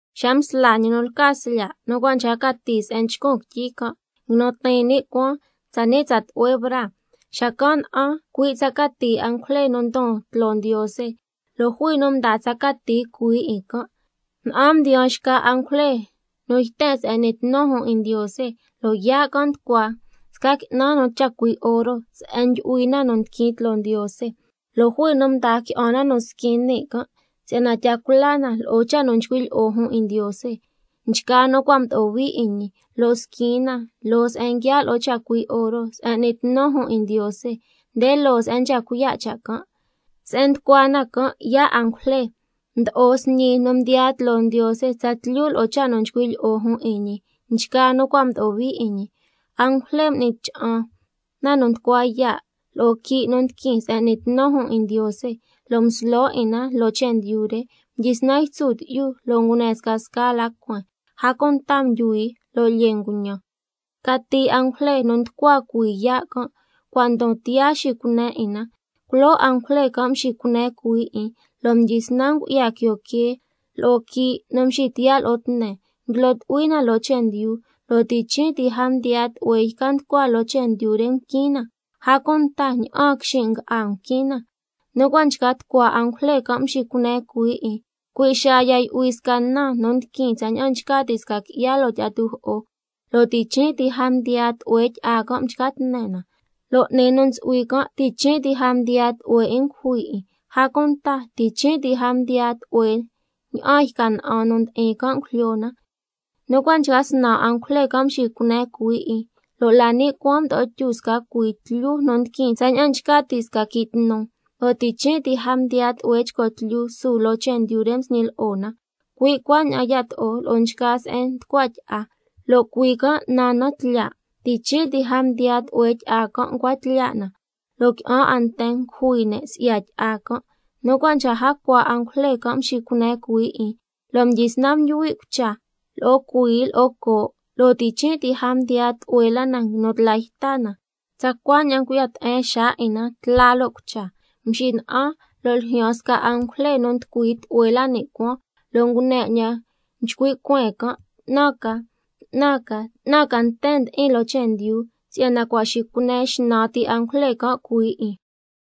Xa msla ñi nu lca Slya' nu cua' nchca cati se'en nchcun quityi can', nguinu tiin ni' cuaan tsani' tsa tlu'hue braa. Xacan' na'an cui' cati angujle nu ndon tloo Ndiose, lo' jui nu mdaa tsa cati cuhuii 'in. Na'an mdiyaan xca angujle nu yten se'en n'ni tnu jun 'in Ndiose, lo' yaa' can' nducua sca qui'nan nu chacui' oro se'en ndyu'hui na nu ndiquin tloo Ndiose. Lo' jui nu mdaa qui'an na nu squin ni' can' si'yana tya cula na lo'o cha' nu nchcui' lyi'o jun 'in Ndiose, nchgaa nu cua' mdo'o hui 'in ñi, lo' squin na loo se'en nguiaa' lo'o chacui' oro se'en n'ni tnu jun 'in Ndiose, nde loo se'en nchca cuiya' cha' can'. Se'en nducua na can' yaa' angujle, mdo'o sñi nu mdiyaa tloo Ndiose tsatlyu lo'o cha' nu nchcui' lyi'o jun 'in ñi, nchgaa nu cua' mdo'o hui 'in ñi. Angujle m'ni cha'an na nu nducua yaa' lo'o quii' nu ndiquin se'en n'ni tnu jun 'in Ndiose, lo' mslo 'in na loo chendyu re, mdyisnan ytsu tyi'yu lo' ngune scasca la cueen, a cunta ndyuhui lo' lyee nguñan. Cati angujle nu nducua cuhuii yaa' can', cua' ndon tiyaa xicune 'in na. Culoo angujle can' mxicune cuhuii 'in, lo' mdyisnan ngu'ya quio quee lo'o quii' nu mxitiyaa' lo'o tne, nguilo tu'hui na loo chendyu, lo' ti' chin' ti a mdiyaa tlu'hue yca nducua loo chendyu re mquin na, a cunta ña'aan quixin' nga'a mquin na. Nu cua' nchca tucua angujle can' mxicune cuhuii 'in, cui' xaa ya yu'hui sca na nu ndiquin tsaña'an nchca ti' sca qui'ya loo tyi'a tujo'o, lo' ti' chin' ti a mdiyaa tlu'hue tyi'a can' mchca tne na. Lo' 'ni nu ntsu'hui can' ti' chin' ti a mdiyaa tlu'hue 'in ngujui 'in, a cunta ti' chin' ti a mdiyaa tlu'hue ña'aan yca na'an nu ndi'in can' ngujlyo na. Nu cua' nchca snan angujle can' mxicune cuhuii 'in, lo' la ni' cuaan mdo'o tyu sca cuii tlyu nu ndiquin tsaña'an nchca ti' sca quii' tnu, lo' ti' chin' ti a mdiyaa tlu'hue chco tlyu su loo chendyu re msñi lo'o na, cui' cuaña'an yato'o lo'o nchgaa se'en nducua tyi'a, lo' cuii can' naan na Tlyaa'. Ti' chin' ti a mdiyaa tlu'hue tyi'a can' ncua tlyaa' na, lo' qui'an 'a nten ngujui ne' si'ya tyi'a can'. Nu cua' nchca jacua angujle can' mxicune cuhuii 'in, lo' mdyisnan ndyuhui' cucha lo'o cuii lo'o coo', lo' ti' chin' ti a mdiyaa tlu'hue la na nguinu tla yta na, tsa cuaña'an ngu'ya te'en xaa 'in na, tla lo' cucha. Mxina'an, lo' ljyaan sca angujle nu nducui tlu'hue la ni' cuaan, lo' ngune 'ñan nchcui' cueen can': 'Tnan ca, 'tnan ca, 'tnan ca nten ndi'in loo chendyu, si'yana cua' xicune xnan ti angujle can' cuhuii 'in.